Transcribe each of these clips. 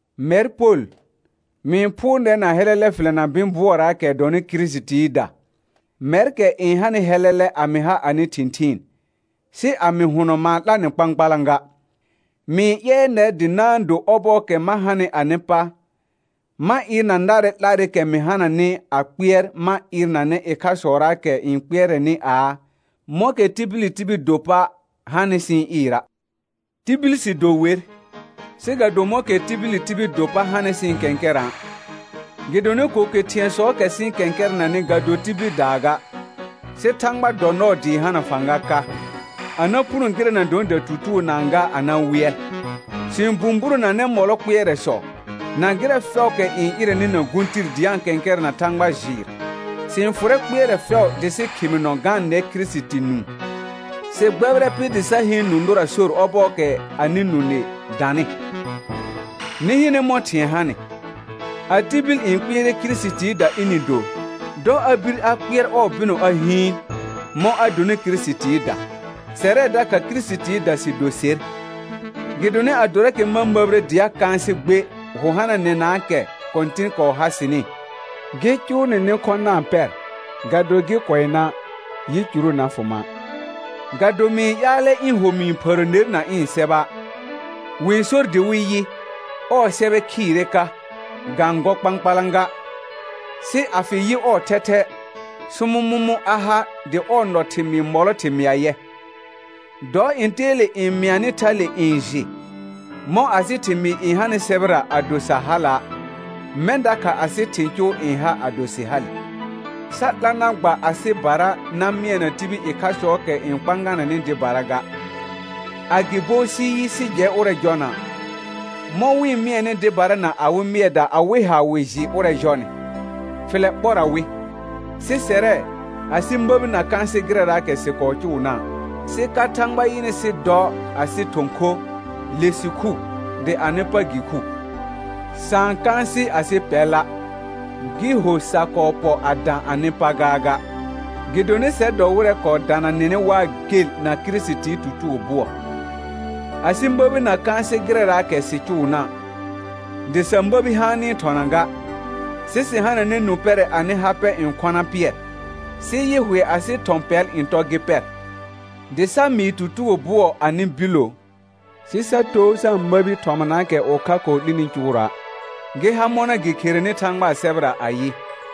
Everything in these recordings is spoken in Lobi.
Mɛr Pol, mɩ-n phʋʋr nɛr na hɛlɛlɛ fɩlɛ na bɩ̃ bʋɔraakɛ dɔnɩ Kirisitiida, mɛrkɛ n hanɩ hɛlɛlɛ a mɩ ha anɩ thɩ̃thɩɩn, sɩ a mɩ hʋnɔ ma-n 'la nɩ kpãkpalã ga. Mɩ-n ƴɛɛ nɛr dɩ na-n do ɔbɔɔkɛ ma hanɩ anɩ pa, ma ɩɩrna narɛ 'larɩkɛ mɩ hananɩ a kpɩɛr ma ɩɩrnanɛ ɩkhasɔraakɛ n kpɩɛrɛnɩ aa, mɔ̃kɛ tibili tibil do pa hanɩ sɩ-n ɩɩra'. Tibil sɩ do wer, sɩ ga do mɔ̃kɛ tibili tibil do pa hanɩ sɩ-n kɛ̃kɛrã'. Gɩdonɩ ko ke thɩ̃ɛsɔɔkɛ sɩ-n kɛ̃kɛrɛnanɩ ga do tibildaa ga, sɩ Thãgba dɔ nɔɔ dɩɩ hana fãga ka, a na puno gɩrɛ na dɔnɩ datutugonaa ga a na wɩɛl. Sɩ-n bũburonanɛ mɔlɔ kpɩɛrɛsɔ, na gɩrɛ fɛʋʋkɛ n ɩrɛnɩ na gũ tir dɩ a-n kɛ̃kɛrɛna Thãgba jɩɩr, sɩ-n fʋrɛ kpɩɛrɛ fɛʋ dɩ sɩ khɩmɩnɔ ga-n nɛ Kirisiti nũu. Sɩ gbɛbɩrɛ pɩ dɩ sa heen nũ nʋra sor ɔbɔɔkɛ anɩ nũ nɩ danɩ. Nɩ hɩnɛ mɔ̃ thɩ̃ɛ hanɩ. A tibil n kpɩɛrɛ Kirisitiida ɩnɩ do, dɔ a bir a kpɩɛr ɔɔ bɩnɔ a hɩɩn, mɔ̃ a donɩ Kirisitiida, sɛrɛ dakha Kirisitiida sɩ do ser. Gɩdonɩ adorakɛ ma məbire dɩ a kãasɩ gbe hʋ hananɛnaakɛ Kɔ̃tɩn kɔɔ ha sɩnɩ, gɩ cʋʋ nɩ nɩ khɔ̃ na-n pɛr ga do gɩ kʋɛ na', yicuru na fʋ ma'. Ga do mɩ-n ƴaalɛ ɩ̃ ho mɩ-n phərə ner na ɩ̃ sɛba'. Wɩ-n sor dɩ wɩ yɩ, ɔɔ sɛbɛ khɩɩrɛ ka, ga-n gɔ kpãkpalã ga, sɩ a fɩ yɩ ɔɔ thɛthɛ, sʋmʋmʋ̃ a ha dɩ ɔɔ nɔ thɩmɩɩ mɔlɔ thɩmɩa yɛ. Dɔ ntɛɛle n mɩanɩ thale n jɩ: Mɔ̃ asɩ thɩmɩɩ n hanɩ sɛbɛra ado sa hala', mɛ̃ dakha asɩ thɩ̃ cʋʋ n ha ado sɩ hale. Sa 'la na gba asɩbara na mɩɛna tibil ɩkhasɔɔkɛ n kpãganɛnɩ dɩbara ga, agɩbo sɩ yɩ sɩ jɛ ʋrɛ jɔna', mɔ̃ wɩ-n mɩɛnɩ dɩbara na awɩ mɩɛda awɩ ha wɩ jɩ ʋrɛ jɔnɩ, fɩlɛ ɓɔra wɩ. Sɩ sɛrɛ, asɩ məbi na kãasɩ gɩrɛraakɛ sɩ kɔɔ cʋʋna', sɩ ka Thãgba yɩnɩ sɩ dɔ asɩ thɔ̃ kho, le sɩ khu, dɩ anɩ pa gɩ khu. Sa-n kãasɩ asɩ pɛla', gɩ ho sa kɔɔ pɔ a dã anɩ pa gaaga, gɩdonɩ sɛr dɔ wɩrɛ kɔɔ dana nɩnɩ waa gel na Kirisitii tutugo bʋɔ. Asɩ məbi na kãasɩ gɩrɛraakɛ sɩ cʋʋna', dɩ sa məbi haanɩ thɔna ga, sɩ sɩ hananɛ nũ pɛrɛ anɩ ha pɛ n khɔna pɩɛr, sɩ yɩ hʋɛ asɩ thɔ̃ pɛl n tɔ gɩ pɛr, dɩ sa mɩɩ tutugo bʋɔ anɩ billo, sɩ sa too sa-n məbi thɔmanaakɛ ʋkha kɔɔ 'lini cʋʋra', gɩ ha mɔna gɩ kherenɩ Thãgbaa sɛbɛra ayɩ: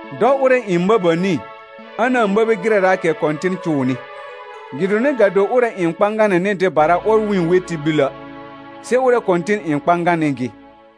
«Dɔ ʋrɛ n məbəni, a na-n məbi gɩrɛraakɛ Kɔ̃tɩn cʋʋnɩ.» Gɩdonɩ ga do ʋrɛ n kpãganɛnɩ dɩbara ɔr wɩ-n we tibilə', sɩ ʋrɛ Kɔ̃tɩn n kpãganɩ gɩ.